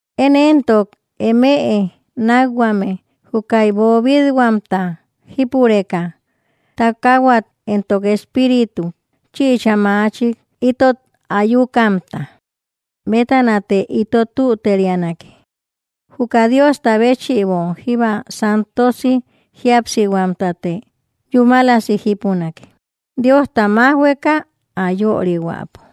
Én entok emëe nakhuame, jukaï bobithuamta jípureka, takahuat entok espiritut chïcha machik itot ayukamta bétanate ito tüterianake, juka Diosta béchïbo jíba santosi jíapsihuamtate yúmalasi jípunake, Diosta majhuëka ä yörihuäpo.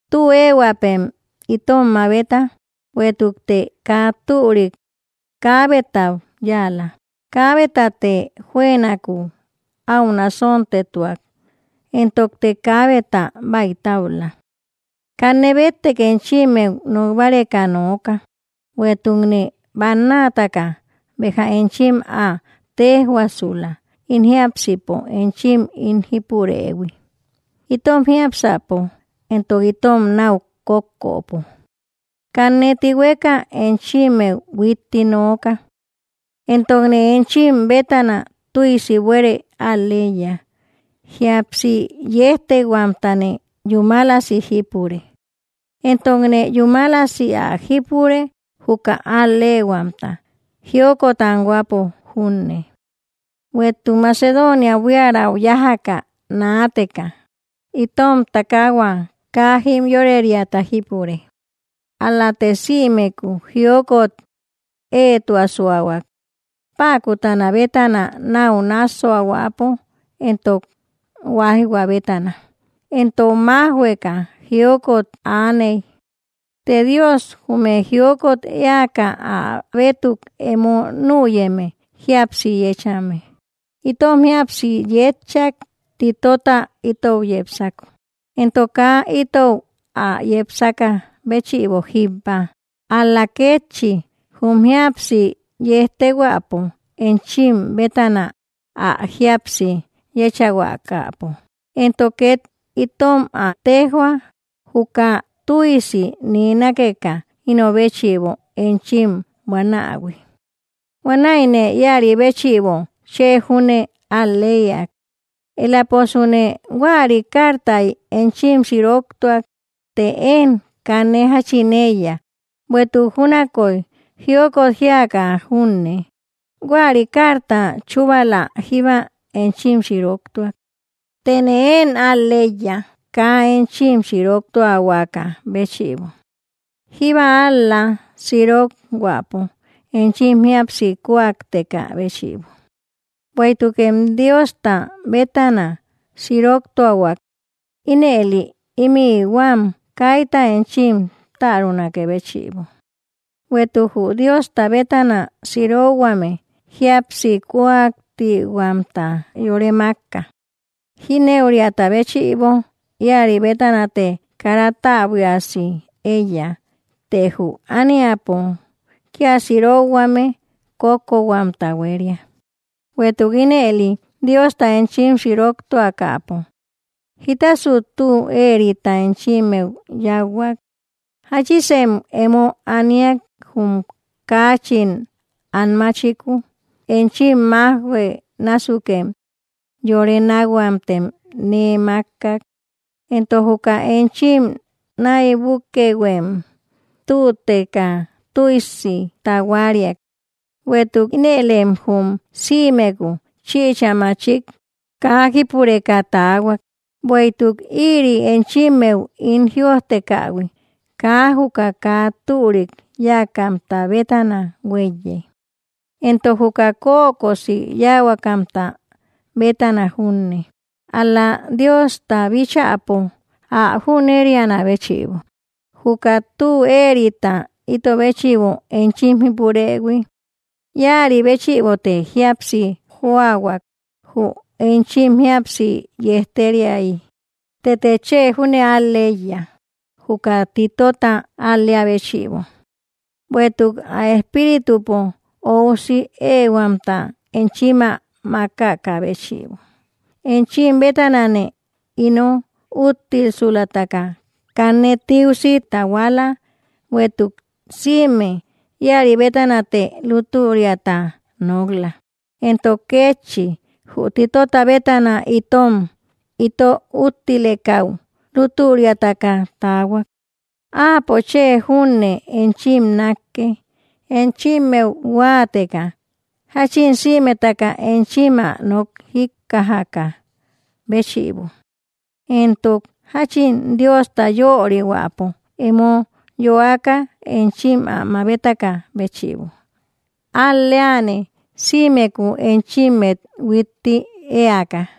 Tü ehuäpem itom mabeta: bueïtukte kaa türik kaabetau yáala, kaabetate juënaku au nasontetuak, entokte kaabeta baïtaula. Kanne bettek enchimmeu nok báreka nooka; bueïtukne bannataka béja enchim ä tejhuasula, ín jiápsipo enchim ín jípurëhui itom jiápsäpo entok itom nau kókköpo. Kanne tihueka enchimmeu huitti nooka. Entokne enchim bétana tüisi buere al‑leiya, jíapsi yejtehuamtane yúmalasi jípure, entokne yúmalasi ä jípure juka al‑lehuamta, jiokot anhuäpo junne. Bueïtuk Macedonia buiaräu yajaka naateka, itom takahua kaa jimyoreriata jípurek, ál-late simeku jiokot eetuasuahuak, päkutana bétana nau nassuahuäpo entok huaijhua bétana entok majhuëka jiokot aaney. Të Dios jume jiokot eäka ä bétuk emo nüyeme jíapsi yechame, itom jíapsi yetchak Titota itou yepsako. Entok kaa itou ä yepsaka béchïbo jíbba, ál‑la kétchi jum jíapsi yejtehuäpo enchim bétana ä jíapsi yechahuakapo, entok ket itom ä tejhuak juka tüisi nee nákeka ino béchïbo enchim buanähui. Huanäine ïari béchïbo chë júne al‑lëiak. Elaposune huäri cartai enchim siroktuak, të én kanne jachin eiya, bueïtuk júnaköi jiokot jiaka junne, huäri carta chubala jíba enchim siroktuak, tëne én al‑leíya, kaa enchim sirok tuahuaka béchïbo jíbba, ál‑la, sirok huäpo enchim jíapsi kuakteka béchïbo; bueïtukem Diosta bétana siroktuahuäk, ínëli, imi huäm kayta enchim tarunakë béchïbo. Bueïtuk jü Diosta bétana sirokhuame, jíapsi kuaktihuamta yore makka, jinëuriata béchïbo, ïari bétanate kara täbuiasi eiya, të jü ániapo kia sirokhuame, kókko huamta huéria. Bueïtuk ínëli Diosta enchim siroktuakäpo, jita tü eerita enchimmeu yauhuak, jachisem emo aniak jum kachin anmáchiku, enchim majhuë násukem yore nakhuamtem nee makkak, entok juka enchim naïbukëhuem tüteka tüisi tahuariak, bueïtuk inëlem jum simeku chïcha machik kaa jípureka taahuak. Bueïtuk ïri enchimmeu ín jïojtekähui, kaa juka kaa türik yakamta bétana hueiye, entok juka kökosi yahuakamta bétana junne, ál‑la, Diosta bíchäpo, ä jünerianä béchïbo, juka tü eerita ito béchïbo enchim jípurëhui. Ïari béchïbote jíapsi joahuak jü enchim jíapsi yejteriayi. Tëte chë júne al‑leíya juka Titota al‑lea béchïbo, bueïtuk ä espíritupo oúsi ehuamta enchim ä makaka béchïbo. Enchim bétanane ino úttilsulataka kanne tiusi tahuala, bueïtuk sïme ïaribétanate lútüriata nok‑la, entok kétchi jü Titota bétana itom ito úttilekäu lútüriataka taahuak. Áapo chë júne enchim nakkë, enchimmeu huateka jachin sïmetaka enchim ä nok jikkajakä béchïbo, entok jachin Diosta yörihuäpo emo yoaka enchim ä mabetakä béchïbo. Al‑leane sïmeku enchimmet huitti ëaka.